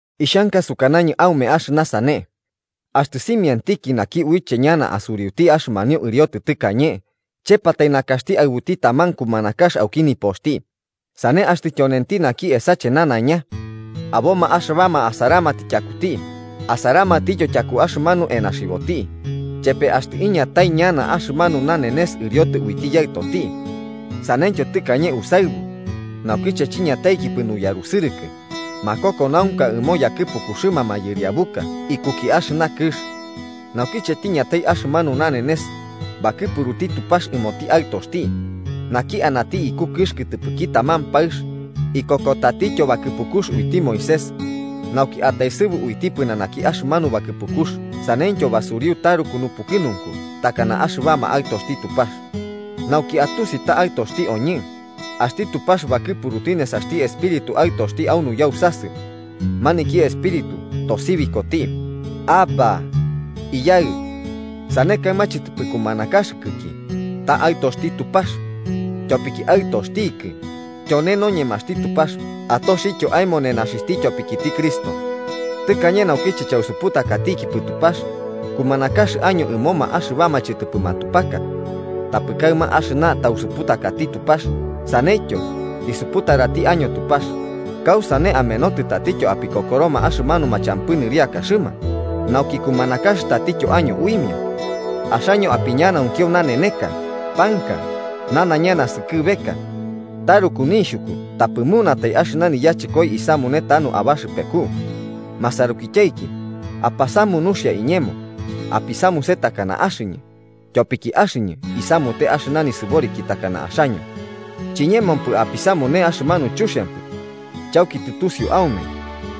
Ixhanka sukanañɨ aume axɨna sane: Axtɨ simiantiki naki uiche ñana asuriuti axɨmanio ɨriotɨ tɨkañe, chepatai nakaxti aɨbuti taman kumanakax auki nipoxti, sane axtɨ tyonenti naki esache nanaiña. Aboma axɨbama asaramatɨ tyakuti asaramatityo tyaku axɨmanu enaxiboti, chepe axtɨ iñatai ñana axɨmanu nanenes ɨriotɨ uiti yaɨtoti. Saneityo tɨkañe usaɨbu: naukiche chiñataikipɨ nuyarusɨrɨkɨ, makokonaunka ɨmo yakɨpukuxɨma mayɨriabuka ikuki axɨna kɨx. Naukiche tiñatai axɨmanu nanenes, bakɨpuruti Tupax ɨmoti Aɨtoxti, naki anati iku kɨx kɨtɨpɨki taman paɨx, ikokotatityo bakɨpukux uiti Moisés, nauki utaesɨbu uiti pɨnanaki axɨmanu bakɨpukux saneityo basuriu taruku nupukɨnunku takana axɨbama aɨtoxti Tupax. Nauki atusi ta aɨtoxti oñɨ, axti Tupax bakɨpuruti nesaxti Espíritu Aɨtoxti au nuyausasɨ. Maniki Espíritu tosibikoti: “¡Abbá! ¡Iyaɨ!” Sane kaɨma chɨtɨpɨ kumanakaxɨkɨki, ta aɨtoxti Tupax. Tyopiki aɨtoxtikɨ, tyone noñemaxti Tupax atoxityo aemo nenaxixhti tyopikiti Cristo. Tɨkañe naukiche chausuputakatikipɨ Tupax, kumanakax año ɨmoma axɨbama chɨtɨpɨ matupaka. Tapɨ kaɨma axɨna tausuputakati Tupax, saneityo, tisuputarati año Tupax, ¿kausane amenotɨ tatityo apikokoroma axɨmanuma champɨ nɨriakaxɨma, nauki kumanakax tatityo año uimia? Axaño apiñanaunkio naneneka, panka, nanaiña naskɨbeka. ¡Taruku nixhuku tapɨ munatai axɨna niyachɨkoi isamute tanu abaxɨpeku! Masarukityaiki, apasamu nuxia iñemo: apisamuse takana axɨñɨ, tyopiki axɨñɨ isamute axɨna nisɨboriki takana axaño. Chiñemopɨ apisamute axɨmanu chuxiampɨ. Chauki tɨtusiu aume,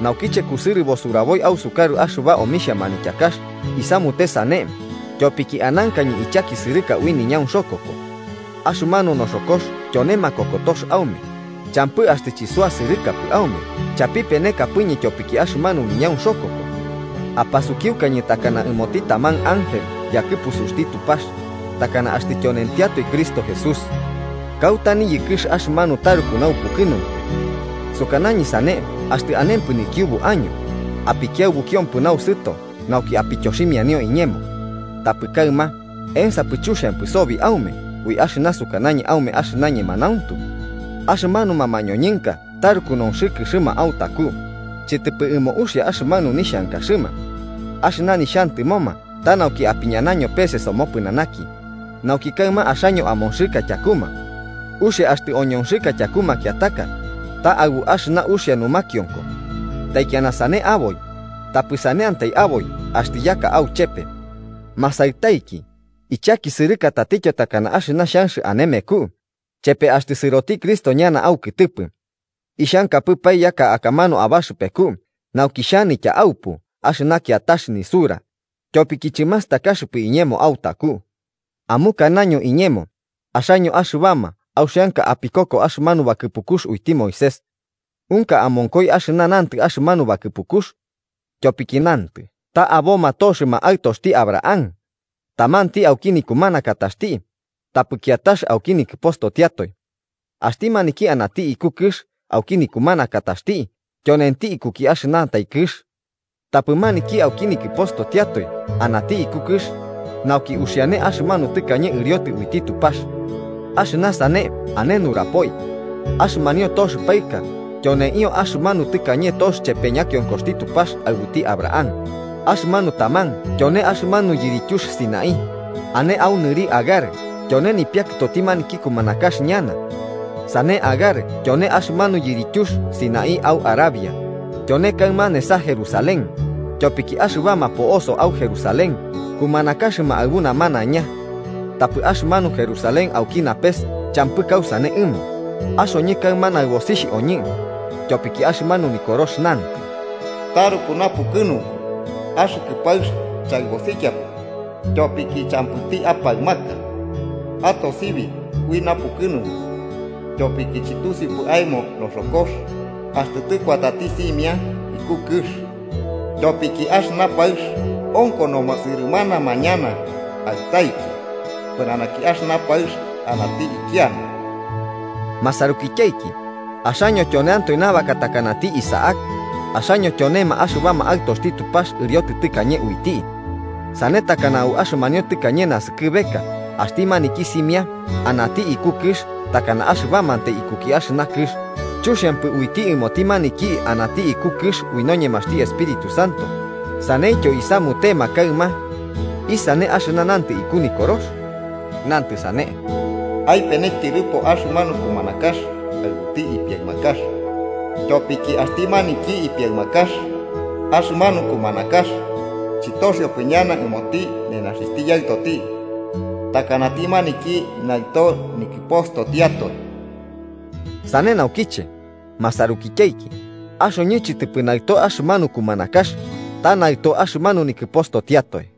naukiche kusɨrɨbo suraboi ausukarɨ axɨba omixhia manityakax isamute sane tyopiki anankañɨ ichakisɨrɨka ui niñaunxokoko. Axɨmanu noxokox tyone makokotox aume, champɨ axtɨ chisuasɨrɨkapɨ aume chapipenekapɨñɨ tyopiki axɨmanu niñaunxokoko, apasukiukañɨ takana ɨmoti taman ángel yakɨpusuxti Tupax, ¡takana axtɨ tyonentiatoe Cristo Jesús! ¿Kauta niyɨkɨx axɨmanu taruku naupukɨnunku? Sukanañɨ sane axtɨ anempɨ nikiubu año, apikiaɨbukiompɨ nausɨto nauki apityoximianio iñemo. Tapɨ kaɨma, ¿ensapɨ chuxiampɨ sobi aume ui axɨna sukanañɨ aume axɨna ñemanauntu? Axɨmanuma mañoñɨnka taruku nonxɨkɨxɨma autaku, chɨtɨpɨ ɨmo uxia axɨmanu nixhankaxɨma. Axɨna nixhantɨmoma ta nauki apiñanaño pese somopɨnanaki, nauki kaɨma axaño amonxɨka tyakuma. Uxia axtɨ oñonxɨka tyaku makiataka, ta aɨbu axɨna uxia numakionko. Taikiana sane aboi, tapɨ saneantai aboi axtɨ yaka auchepe. Masaɨtaiki, ichakisɨrɨka tatityo takana axɨna xhanx ane meku, chepe axtɨ sɨroti Cristo ñana aukɨtɨpɨ. ¡Ixhankapɨpae yaka akamanu abaxɨpeku nauki xhanitya aupu axɨna kiatax nisura, tyopiki chɨmastakaxɨpɨ iñemo autaku! Amukanaño iñemo, axaño, axɨbama auxianka apikoko axɨmanu bakɨpukux uiti Moisés: Unka amonkoi axɨna nantɨ axɨmanu bakɨpukux. Tyopiki nantɨ ta aboma toxɨma aɨtoxti Abraham: tamanti auki nikumanakataxti, tapɨti kiatax auki nikɨpostotiatoe. Axti maniki anati iku kɨx auki nikumanakataxti tyonenti ikuki axɨnantai kɨx. Tapɨti maniki auki nikɨpostotiatoe anati iku kɨx nauki uxiane axɨmanu tɨkañe ɨriotɨ uiti Tupax. Axɨna sane ane nurapoi. Axɨmanio tox paɨka tyoneio axɨmanu tɨkañe tox chepe ñakionkoxti Tupax aɨbuti Abraham: axɨmanu taman tyone axɨmanu yirityux Sinaí, ane au nɨri Agar tyone nipiakɨtoti maniki kumanax ñana. Sane Agar tyone axɨmanu yirityux Sinaí au Arabia, tyone kaɨma nesa Jerusalén, tyopiki axɨbama po'osoma au Jerusalén kumanakaxɨma aɨbu namanaiña. Tapɨ axɨmanu Jerusalén auki napes champɨ kausane ɨmo, axoñɨ kaɨma naɨbosixh oñɨ. Tyopiki axɨmanu Nikorox nantɨ: “Taruku napukɨnunku, axɨkɨ paɨx chaɨbosikiapɨ tyopiki, champɨti apaɨmaka. Atosibi ui napukɨnunku, tyopiki chɨtusiupɨ aemo noxokox axtɨ tɨkuatati simia iku kɨx. Tyopiki axɨna paɨx onkonoma sɨrɨmanama ñana aɨtaiki pɨnanaki axɨna paɨx anati ikiana.” Masarukityaiki, axaño tyoneantoe nabaka takanati Isaac: axaño tyonema axɨbama aɨtoxti Tupax ɨriotɨ tɨkañe uiti. Sane takana au axɨmanio tɨkañe naskɨbeka axti maniki simia anati iku kɨx takana axɨbamantai ikuki axɨna kɨx chuxiampɨ uiti ɨmoti maniki anati iku kɨx ui noñemaxti Espíritu Santo, saneityo isamutema kaɨma. ¿Isane axɨna nantɨ iku Nikorox? Nantɨ sane: “Aipene tyɨrɨpo axɨmanu kumanakax aɨbuti ipiaɨmakax, tyopiki axti maniki ipiaɨmakax axɨmanu kumanakax chɨtoxiopɨ ñana ɨmoti nenaxixhti Yaɨtoti takanati maniki naɨto nikɨpostotiatoe.” Sane naukiche, masarukityaiki, axoñɨ chɨtɨpɨ naɨto axɨmanu kumanakax, ta naɨto axɨmanu nikɨpostotiatoe.